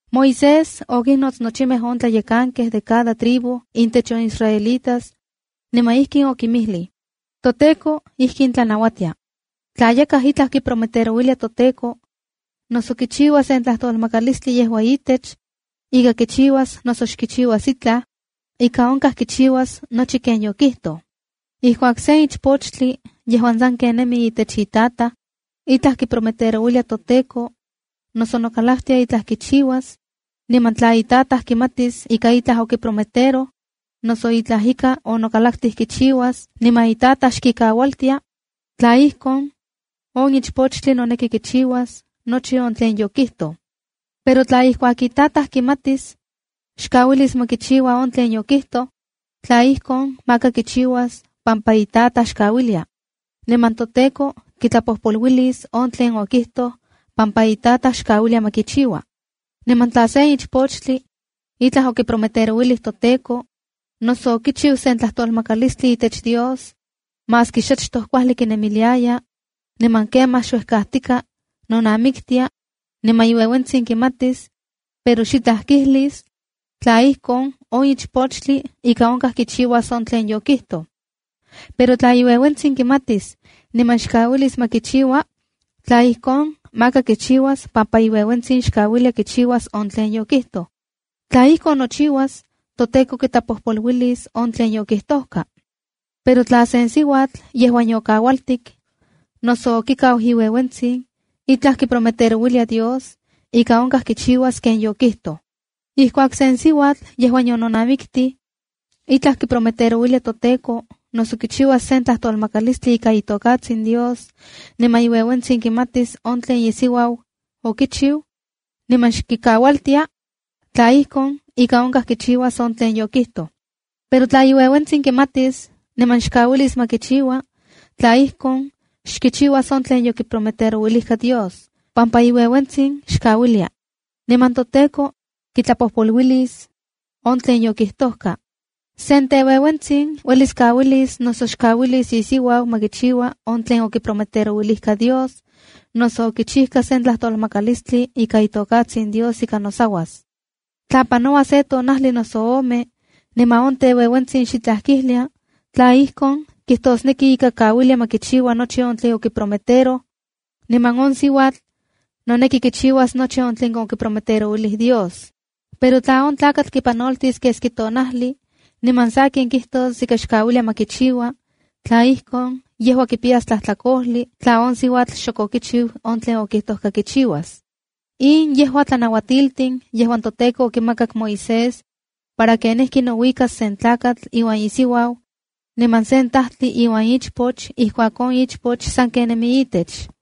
Moisés okinnots nochimej on tlayekankej de cada tribu intech on israelitas, niman ijkin okinmijlij: “ToTEKO ijkin tlanauatia: Tla yakaj itlaj kiprometerouilia toTEKO, noso kichiua sen tlajtolmakalistli yejua itech ika kichiuas noso xkichiuas itlaj, ika onkaj kichiuas nochi ken yokijtoj. ’Ijkuak sen ichpochtli yejuan sanken nemi itech itataj, itlaj kiprometerouilia toTEKO, noso nokalaktia itlaj kichiuas, niman tla itataj kimatis ika itlaj okiprometeroj, noso itlaj ika onokalaktij kichiuas niman itataj xkikaualtia, tla ijkon, on ichpochtli noneki kichiuas nochi on tlen yokijtoj. Pero tla ijkuak itataj kimatis, xkauilis ma kichiua on tlen yokijtoj, tla ijkon, maka kichiuas pampa itataj xkauilia. Niman toTEKO kitlapojpoluilis on tlen okijtoj pampa itataj xkauilia ma kichiua. ’Niman tla sen ichpochtli itlaj okiprometerouilij toTEKO, noso okichiu sen tlajtolmakalistli itech Dios, maski xachtoj kuajli kinemiliaya, niman kemaj xuejkajtika nonamiktia, niman iueuentsin kimatis pero xitlaj kijlis, tla ijkon, on ichpochtli ika onkaj kichiuas on tlen yokijtoj. Pero tla iueuentsin kimatis niman xkaualis ma kichiua, tla ijkon, maka kichiuas pampa iueuentsin xkauilia kichiuas on tlen yokijtoj. Tla ijkon nochiuas, toTEKO kitlapojpoluilis on tlen yokijtojka. ’Pero tla sen siuatl yejuan yokaualtik noso okikau iueuentsin itlaj kiprometerouilia Dios, ika onkaj kichiuas ken yokijtoj. ’Ijkuak sen siuatl yejuan yononamiktij, itlaj kiprometerouilia toTEKO, noso kichiuas sen tlajtolmakalilistli ika itokatsin Dios, niman iueuentsin kimatis on tlen isiuau okichiu, niman xkikaualtia, tla ijkon, ika onkaj kichiuas on tlen yokijtoj. Pero tla iueuentsin kimatis niman xkauilis ma kichiua, tla ijkon, xkichiuas on tlen yokiprometerouilijka Dios, pampa iueuentsin xkauilia. Niman toTEKO kitlapojpoluilis on tlen yokijtojka. ’Sen teueuentsin uelis kauilis, noso xkauilis isiuau ma kichiua on tlen okiprometerouilijka Dios, noso okichijka sen tlajtolmakalilistli ika itokatsin Dios ika nosauas. Tla panoua se tonajli noso ome, niman on teueuentsin xitlaj kijlia, tla ijkon, kijtosneki ika kauilia ma kichiua nochi on tlen okiprometeroj, niman on siuatl noneki kichiuas nochi on tlen okiprometerouilij Dios. Pero tla on tlakatl kipanoltis keski tonajli niman sakin kijtos ika xkauilia ma kichiua, tla ijkon, yejua kipiyas tlajtlakojli tla on siuatl xok okichiu on tlen okijtojka kichiuas.” In yejua tlanauatiltin yejuan toTEKO okimakak Moisés para kenijki nouikas sen tlakatl iuan isiuau, niman sen tajtli iuan ichpoch ijkuak on ichpoch sanken nemi itech.